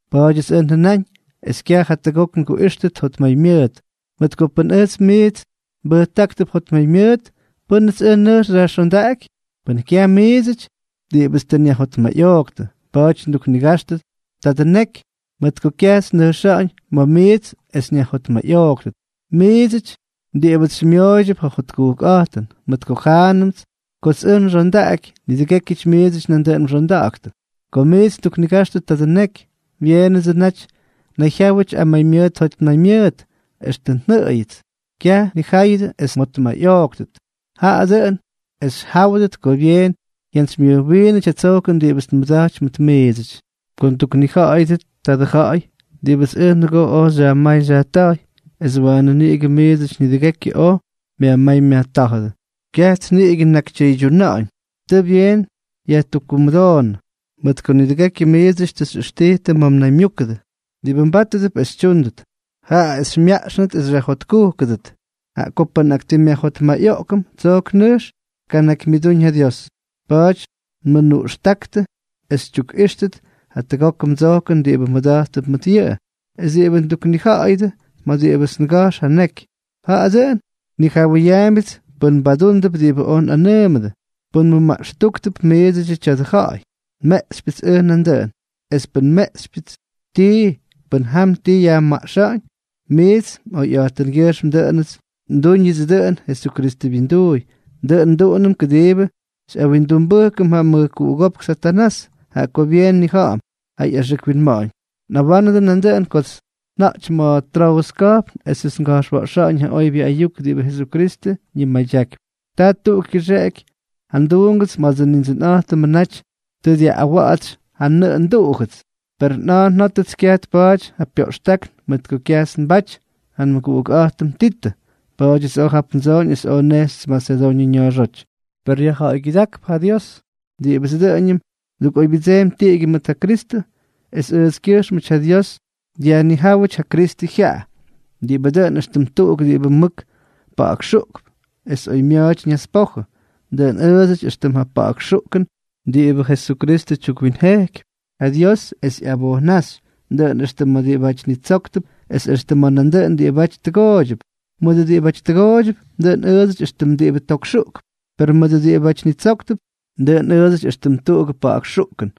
Pa̱a̱dyʉts ʉj njʉnáñ es kyaj jatʉgok nguꞌíxtʉt jotmaymyʉʉt. Mʉt ko pʉn ʉjts miits nbʉjtáktʉp jotmaymyʉʉt, ¿pʉ́nʉts ʉj nʉjx xyajxondaꞌaky?, pʉn kyaj miidsʉty, diꞌibʉts tʉ nyajjotmayꞌooktʉ. Pa̱a̱ty nduknigajxtʉ tadʉ neky mʉt ko kyajts nnʉjxáñ ma̱ miits es nyajjotmayꞌooktʉt, miidsʉty diꞌibʉts xymyooydyʉp ja jotkujkꞌa̱jtʉn; mʉt ko jʉnánʉts kots ʉj nxondaꞌaky, nidʉgékyʉty miidsʉty nandʉꞌʉn mxonda̱ꞌa̱ktʉ. Kots miits nduknigajxtʉ tadʉ neky, byeenʉdsʉ naty nnayjyáwʉty amaymyʉʉt jotmaymyʉʉt, extʉ jʉʉyʉts. Kyaj nnija̱ꞌa̱yʉdʉ es mjotmayꞌooktʉt, jaꞌa dʉꞌʉn es xyjáwʉdʉt ko byeen jyantsymyʉjwiinʉty ja tsojkʉn diꞌibʉts nmʉda̱jtypy mʉt miidsʉty. Ko nduknija̱ꞌa̱yʉdʉ tadʉ ja̱ꞌa̱y diꞌibʉts ʉj nʉgoo oj xyajmáy xyajta̱jy, es waanʉ niꞌigʉ miidsʉty nidʉgekyʉ oj myajmáy myajtá̱jʉdʉ, kyajts niꞌigʉ nnakytyʉydyuna̱ꞌa̱ñ. Tʉ byeen yajtukkumʉdoonʉ mʉt ko nidʉgekyʉ miidsʉty tʉ xyꞌʉxtijtʉ ma̱ mnaymyúkʉdʉ. Diꞌibʉ mbátʉdʉp es xytyúndʉt, jaꞌa es xymyaꞌxnʉt es xyajjotkujkʉdʉt, jaꞌa ko pʉn nꞌakꞌyajjotmayꞌoꞌkʉm, tsojk nʉjx tkanakymyʉdúñ ja Dios. Pa̱a̱ty nmʉnuꞌxtáktʉ es xytyukꞌíxtʉt jatʉgokʉ mdsojkʉn diꞌibʉ mmʉda̱jttʉp mʉt yʉꞌʉ. Es diꞌibʉ nduknija̱ꞌa̱yʉdʉ ma̱ diꞌibʉts ngajx ja neky, jaꞌa dʉꞌʉn nnijawʉyaambyʉts pʉn mbadúndʉp diꞌibʉ oj nꞌanʉʉmʉdʉ. Pʉn mmʉmaꞌxtujktʉp miidsʉdyʉ tya̱dʉ ja̱ꞌa̱y, nmeꞌxypyʉts ʉj nandʉꞌʉn. Es pʉn nmeꞌxypyʉts tii, pʉn jam ti yajmaꞌxa̱ꞌa̱ñ, miits mꞌoyꞌa̱jtʉngyʉjxm ndúñʉts dʉꞌʉn Jesukristʉ wyinduuy. Dʉꞌʉn nduꞌunʉm kʉdiibʉ xyꞌawindumbʉjkʉm ja mʉjkuꞌugópk Satanás, jaꞌa ko byeen nnija̱ꞌa̱m ja ꞌyaxʉk winma̱ꞌa̱ñ. Nꞌawánʉdʉ nandʉꞌʉn kots nja̱jty ma̱ Troʉs ka̱jpn esʉts nga̱jxwa̱ꞌxa̱ꞌa̱ñ ja oybyʉ ayuk diꞌibʉ Jesukristʉ ñimadyakypy, taa tuꞌuk kyʉxeꞌky ja nduungʉts ma̱dsʉ Nindsʉnꞌa̱jtʉmʉ naty tʉ dyaꞌꞌawa̱ꞌa̱tsy ja nnʉꞌʉ nduꞌujʉts. Perʉ nꞌa̱a̱ njótʉts kyaj tpaty ja pyoꞌxtákn mʉt ko kyajts nbaty ja nmʉguꞌukꞌa̱jtʉm Titʉ. Pa̱a̱dyʉts oj jap ndsooñ es oj nnejxy Masedoñʉ ña̱a̱xóty. Per yajja̱ꞌa̱ygyʉdákp ja Dios, diꞌibʉts dʉꞌʉñʉm ndukꞌoybyʉdseempy tiꞌigyʉ mʉt ja Kristʉ, es ʉʉtskyʉjxmʉty ja Dios dyajnijáwʉty ja Kristʉ jyaꞌa, diꞌibʉ dʉꞌʉn éxtʉm tuꞌuk diꞌibʉ mʉk pa̱ꞌa̱kxuꞌkp es oymya̱a̱ty ñaspojʉ. Dʉꞌʉn ʉʉdsʉty éxtʉm ja pa̱ꞌa̱k xuꞌkʉn diꞌibʉ Jesukristʉ tyukwinjejkypy ja Dios es ꞌyabojwaꞌxy, dʉꞌʉn extʉ ma̱ diꞌibáty nitsóktʉp es extʉ ma̱ nandʉꞌʉn diꞌibáty tʉgooydyʉp. Mʉdʉ diꞌibáty tʉgooydyʉp, dʉꞌʉn ʉʉdsʉty éxtʉm diꞌibʉ tok xuꞌkp; per mʉdʉ diꞌibáty nitsóktʉp, dʉꞌʉn ʉʉdsʉty éxtʉm tuꞌugʉ pa̱ꞌa̱k xuꞌkʉn.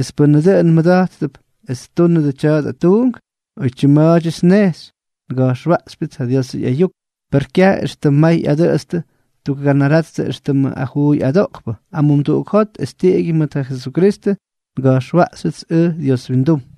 ¿Es pʉ́nʉ dʉꞌʉn mada̱ꞌa̱gʉp es ttúnʉdʉ tya̱dʉ tuunk? Oytyim ma̱a̱dyʉts nnejxy, nga̱jxwaꞌxypyʉts ja Diosʉ ꞌyayuk. Per kyaj éxtʉm may ꞌyadʉꞌʉtstʉ ttukganarattʉ éxtʉmʉ ajuuy adoꞌkpʉty, amumduꞌuk jot es tiꞌigyʉ mʉt ja Jesukristʉ nga̱jxwaꞌxyʉts ʉj Dios windum.